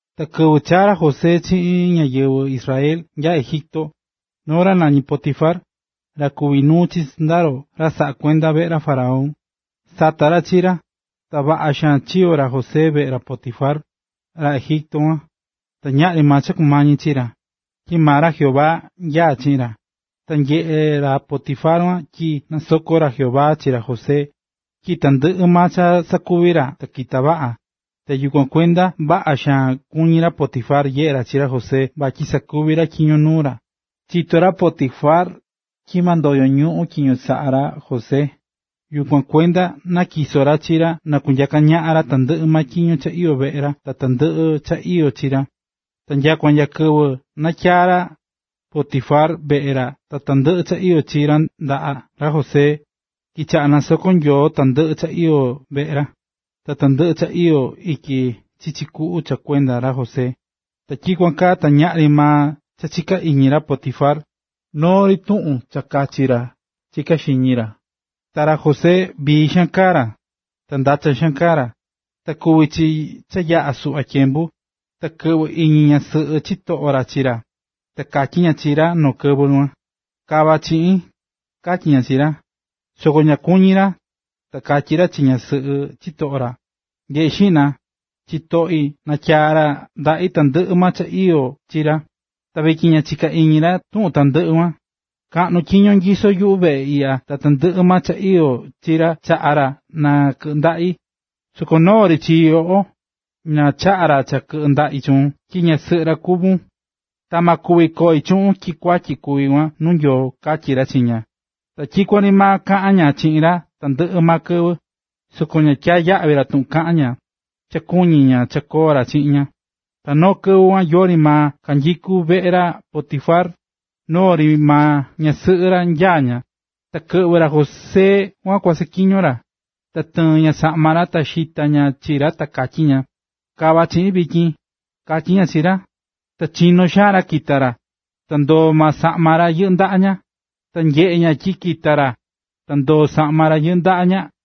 Ta kɨvɨ chaa̱ ra José chiꞌin ñáyɨvɨ Ismael nya Egipto, noo ra nañí Potifar, ra kuví nuu chi sɨndaro cha saꞌakuendá veꞌe ra faraón, sata̱ ra chi ra. Ta vaꞌa xaan chiyo̱ ra José veꞌe ra Potifar, ra Egipto kuan, ta ñaꞌri maa cha kumañí chi ra, tyi maa ra Jehová nyaá chiꞌin ra. Ta nyeꞌe̱ ra Potifar tyi nasokó ra Jehová chi ra José, tyi tandɨꞌɨ maa cha sakuví ra ta kitá vaꞌa, ta yukuan kuenda vaꞌa xaan kuñí ra Potifar nyeꞌe ra chi ra José vatyi sakuví ra tyiño nuu ra. Chitó ra Potifar tyi ma ndoyo ñuꞌun tyiño saꞌá ra José, yukuan kuenda natyiso̱ ra chi ra na kunyaa ndaꞌa ra tandɨꞌɨ tyiño cha iyó veꞌe ra ta tandɨꞌɨ cha iyó chi ra. Ta nyakua nya kɨvɨ natyaa̱ ra Potifar veꞌe ra ta tandɨꞌɨ cha iyó chi ra ndaꞌa ra José, kichaꞌa̱ nasokó ra Jehová tandɨꞌɨ cha iyó veꞌe ra, ta tandɨꞌɨ cha iyó ityi chichi kuꞌu cha kuenda ra José. Ta tyikuan kaa ta ñaꞌri maa cha chiká iñi ra Potifar. Noo ri tuꞌun cha kachi ra chiká xiñi ra. Ta ra José vii xaan kaá ra, ta ndachan xaan kaá ra. Ta kuvi̱ chi cha yaꞌa̱ suꞌva tyembu, ta kɨꞌvɨ̱ iñi ñasɨꞌɨ chitoꞌo ra chi ra, ta katyí ña chi ra noo kɨvɨ kuan: ―Ka̱va chiꞌin ―katyí ña chi ra. Soko ña kuñi̱ ra, ta katyí ra chi ñasɨꞌɨ chitoꞌo ra: ―Nye̱ꞌe xiꞌna, chitoꞌi natyaa̱ ra ndaꞌi tandɨꞌɨ maa cha iyó chi ra, ta vityin ña chiká ka iñi ra tuꞌun tandɨꞌɨ kuan. Kaꞌnu tyiño nyisó yuꞌu veꞌe iꞌya ta tandɨꞌɨ maa cha iyó chi ra chaꞌa ra na kɨꞌɨ ndaꞌi, soko noo ri chi yoꞌo, ña chaꞌa̱ ra cha kɨꞌɨ ndaꞌi chuun tyi ñasɨꞌɨ ra kuvún. Ma kuvi koi chuꞌun tyi kuatyi kuví kuan nuu Nyoo ―katyí ra chi ña. Tyikuan ri maa kaꞌán ña chiꞌin ra tandɨꞌɨ maa kɨvɨ, soko ña tyaá yaꞌvi ra tuꞌun kaꞌán ña, cha kuñí ña cha koo ra chiꞌin ña. Ta noo kɨvɨ kuan yori maa kanyikú veꞌe ra Potifar, noo ri maa ñasɨꞌɨ ra nyaá ña, ta kɨꞌvɨ̱ ra José kua saꞌatyiño ra. Ta tɨɨ̱n ña saꞌma ra ta xita̱ ña chi ra ta katyí ña: ―Ka̱va chiꞌin vityin ―katyí ña chi ra. Ta chino̱ xaan ra kita̱ ra, ta ndoo̱ maa saꞌma ra, yɨꞌɨ́ ndaꞌa ña. Cha nyeꞌe̱ ña tyi kita̱ ra, ta ndoo̱ saꞌma ra yɨꞌɨ́ ndaꞌa ña,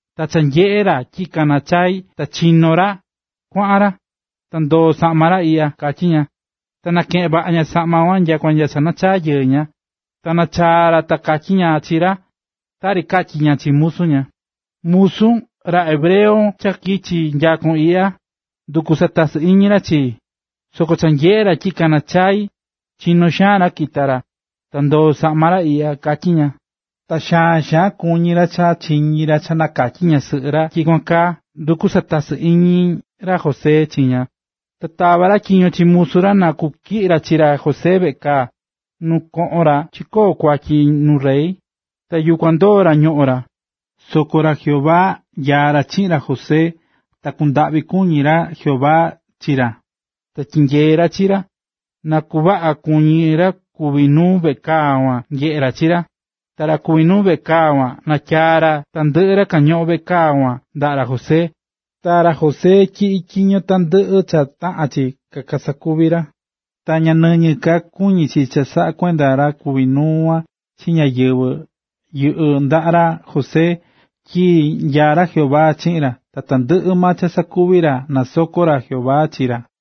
ta cha nyeꞌe̱ ra tyi kaná chai ta kikono̱ ra kuaꞌan ra, ta ndoo̱ saꞌma ra iꞌya ―katyí ña. Ta nakeꞌe̱n vaꞌa ña saꞌma kuan nyakua nya cha nachaa̱ yɨɨ ña. Ta cha nachaa̱ ra ta katyí ña chi ra tari katyi̱ ña chi musu ña: ―Musun, ra hebreo cha kichi̱ nyakon iꞌya, nduku̱ satasɨ iñi ra chii. Soko cha nyeꞌe̱ ra tyi kaná chaa xain, chinó xaan ra kita̱ ra, ta ndoo̱ saꞌma ra iꞌya ―katyí ña. Ta xaan xaan kuñí ra cha chiñi̱ ra cha nakatyí ñasɨꞌɨ ra tyi tyikuan kaa nduku̱ satasɨ iñi ra José chi ña. Ta tava̱ ra tyiño chi musu ra na kutyiꞌi ra chi ra José veꞌe kaa, nu kañoꞌón ra chikoó kuatyi nuu rey, ta yukuan ndoo̱ ra ñoꞌón ra. Soko ra Jehová nyaá ra chiꞌin ra José, ta kundaꞌvi kuñí ra Jehová chi ra, ta tyinyeé ra chi ra, na kuvaꞌa kuñí ra kuví nuu veꞌe kaa kuan nyeꞌé ra chi ra. Ta ra kuví nuu veꞌe kaa kuan natyaa̱ ra tandɨꞌɨ ra kañoꞌón veꞌe kaa kuan ndaꞌa ra José, ta ra José tyiꞌí tyiño tandɨꞌɨ cha taꞌán chi kasakuvi ra. Ta ña nɨñɨ ka kuñí chi cha saꞌakuendá ra kuví nuu kuan chi ñáyɨvɨ yɨꞌɨ́ ndaꞌa ra José, tyi nyaá ra Jehová chiꞌin ra, ta tandɨꞌɨ maa cha sakuví ra ta nasokó ra Jehová chi ra.